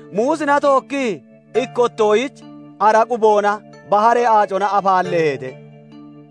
Muusina tookkii ikkottoyich, ara quboonaa baharee aacona afaalleeheete.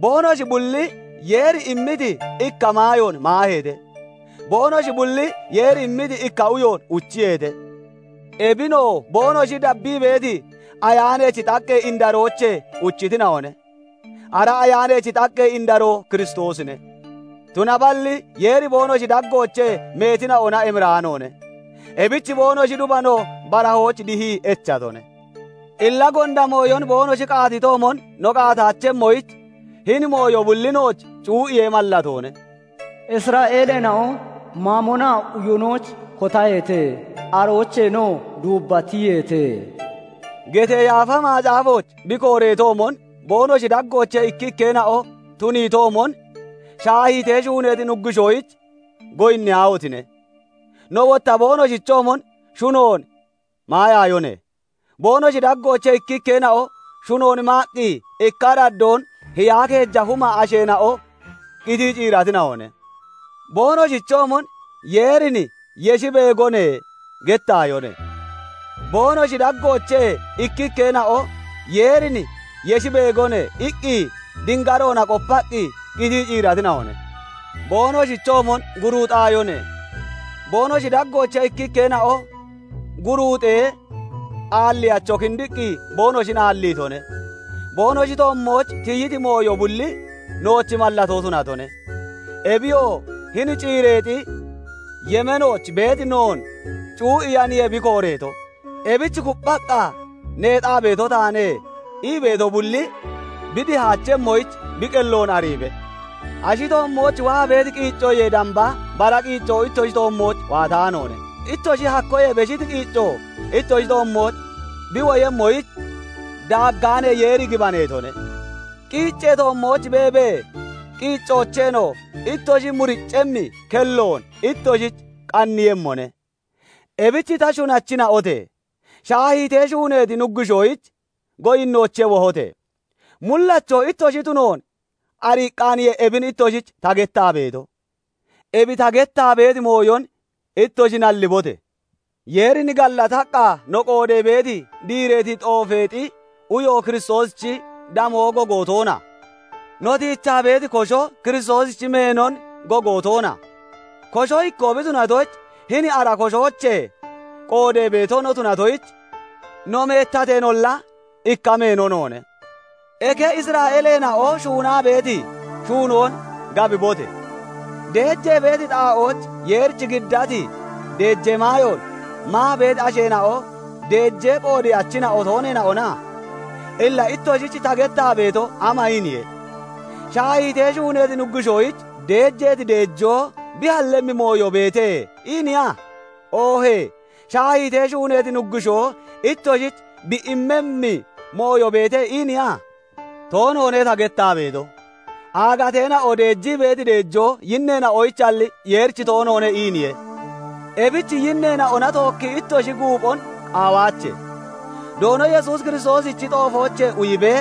Boonoshi bulli Yeeri immiti ikka maayoon maaheete; boonoshi bulli Yeeri immiti ikka uyoon uchiyeete; ebinoo boonoshin dabbii beeti Ayaanachi xaqqee indaroochee uchitina'one; ara Ayaanachi xaqqee indaroo Kiristoosine. Tunaballi Yeeri boonoshi daggoochee meetina'ona emiraanoone; ebich boonoshi dubano barahooch dihii echatone. hIlla gonda mooyon boonoshi qaatitoomon no qaataachemmoyich, hini mooyo bulli nooch cuu'iyee mallatoone. "Isra'eeleena'o mamonaa uyonoyich kotaheete; aroocheenoo duubba tiyiyeete" getee Yaafa Macaafooch bi kooreetoomon, boonoshi daggoochee ikkikkeena'o tuniitoomon, shaahiitee shuuneeti nuggushoyich goyinniyaahotine! No wotta boonoshichoomon shunoon maayaayone; boonoshi daggoochee ikkikkeena'o shunoon maaqqi ikka araddoon hiyaa keeja huma asheena'o qitii ciiratina'one. Boonoshichoomon "Yeerin yeshi beegmmone" gettaayone; boonoshi daggoochee ikkikkeena'o "Yeerin yeshi beegone" iqqi dingaroona qopaqqi qitii ciiratina'one. Boonoshichoomon guruuxaayone; boonoshi daggoochee ikkikkeena'o guruuxee, aalliyacho kindiqqi boonoshin aalliitone. Boonoshi toommooch tiyiti mooyo bulli nooch mallatoo tunatone; ebiyoo hini ciireexi yemeenooch beeti noon cuu'iyaniye bi kooreeto. Ebich "Kupphaqqa neexaa beeto taane" ii beeto bulli bi dihaachemmoyich, bi qelloon ariibe. Ashi toommooch waa beeti qiiccoyee damba bara qiicco ittoshi toommooch waataanoone; ittoshi hakkoyee beshiti qiicco ittoshi toommooch bi woyemmoyich daaggaanee Yeeri gibaneetone; qiiccee toommooch beebee qiiccoocheenoo ittoshi muriccemmi kelloon ittoshich qanniiyemmone. Ebich ta shunachina'ote! Shaahiitee shuuneeti nuggushoyich goyinnoochee wohote! Mullacho ittoshi tunoon ariiqqaaniye ebin ittoshich ta gettaa beeto; ebi ta gettaa beeti mooyon ittoshi nallibote! Yeerin gallataqqa no qoodee beeti, diireeti xoofeexi uyo Kiristoosichi damoon gogo toona? No tiichaa beeti kosho Kiristoosichi meenon gogo toona? Kosho ikkoo bi tunatoyich, hini ara koshoochee qoodee beeto no tunatoyich, no meettateenolla, ikka meeno noone. Eke Isra'eeleena'o shuunaa beeti shuunoon gabibote! Deejee beeti xaa'ooch Yeerich giddati deejee maayoon maa beeti asheena'o deejee qoodeyachina'o tooneena'ona? Illa ittoshich ta gettaa beeto ama iiniye? "Shaahiitee shuuneeti nuggushoyich deejeeti deejoo bi hallemmi mooyo beete" iiniya? Oohee "Shaahiitee shuuneeti nuggushoo ittoshich bi immemmi mooyo beete" iiniya? Toonoone; ta gettaa beeto, "Aagateena'o deejii beeti deejoo yinneena'oyichalli, Yeerich toonoone" iiniye. Ebich yinneena'ona tookki ittoshi guuphon qaawaache. Doono Yesuus Kiristoosichi xoofoochee uyibee,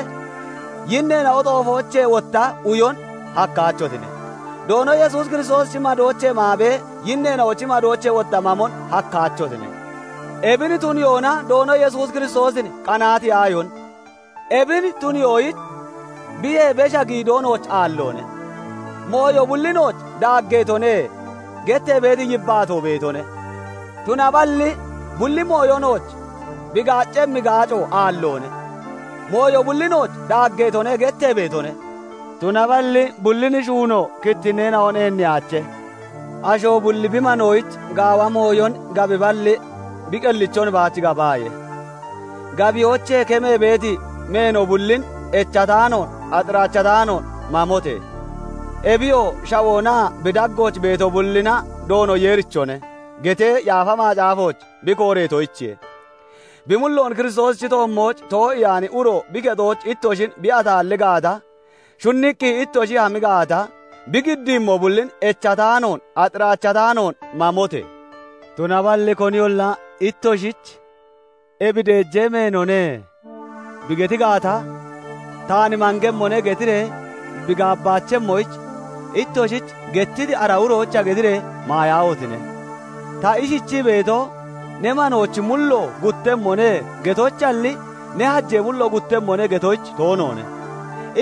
yinneena'o xoofoochee wotta uyon hakkaachotine; Doono Yesuus Kiristoosichi madoochee maabee, yinneena'ochi madoochee wotta mamon hakkaachotine. Ebin tuniyoona Doono Yesuus Kiristoosin qanaatiyaayone. Ebin tuniyoyich biyee besha giidoo nooch aalloone. "Mooyo bulli nooch daaggeetone" gettee beeti yibbaatoo beetone; tunaballi bulli mooyo nooch bi gaaccemmi gaaco aalloone. "Mooyo bulli nooch daaggeetone" gettee beetone; tunaballi bullin shuuno kittinneena'on eenniyaache. Asho bulli bi manoyich gaawemmi mooyon gabiballi, bi qellichon baach gabaaye. Gabiyoochee kemee beeti meeno bullin echataanoon, axiraachataanoon mamote! Ebiyoo "Shawoonaa bi daggooch beeto bullina Doono Yeerichone" getee Yaafa Macaafooch bi kooreetoyichiye. Bi mulloon Kiristoosichi toommooch too'iyaani uro bi kexooch ittoshin bi ataalli gaata, shunniqqi ittoshi hami gaata, bi giddiimmo bullin echataanoon, axiraachataanoon mamote! Tunaballi koniyolla ittoshich "Ebi deejee meenoone" bi geti gaata, "Taan mangemmone" getiree bi gabaachemmoyich, ittoshich gettiti ara uroyicha getiree maayaahotine! Ta ishichii beeto, "Ne manoochi mullo guttemmone" getoyichalli, "Ne hajee mullo guttemmone" getoyich toonoone.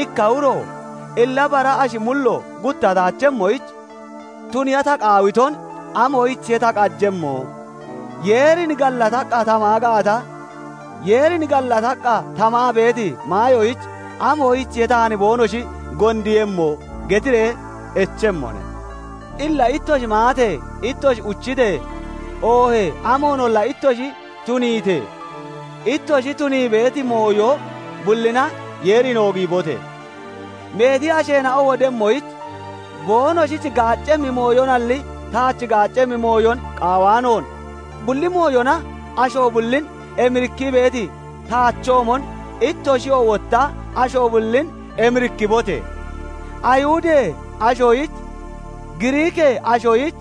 Ikka uro "Illa bara ashi mullo guttataachemmoyich tuniiya ta qaawiton amoyichiye ta qajemmo? Yeerin gallataqqa ta maa gaata, Yeerin gallataqqa ta maa beeti maayoyich, amoyichiye taan boonoshi gondiiyemmo?" getiree echemmone. Illa ittoshi maatee, ittoshi uchitee, oohee amoonolla ittoshi tuniitee, ittoshi tunii beeti mooyo bullina Yeerin oogiibote! Meeti asheena'o wodemmoyich, boonoshich gaaccemmi mooyonalli taach gaaccemmi mooyon qaawaanoon, bulli mooyona asho bullin emirikkii beeti taachoomon, ittoshiyoo wotta asho bullin emirikkibote! Ayihudee ashoyich, Giriikee ashoyich,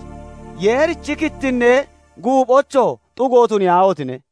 Yeerichi kittinnee guuphoyichoo xugo tuniyaahotine!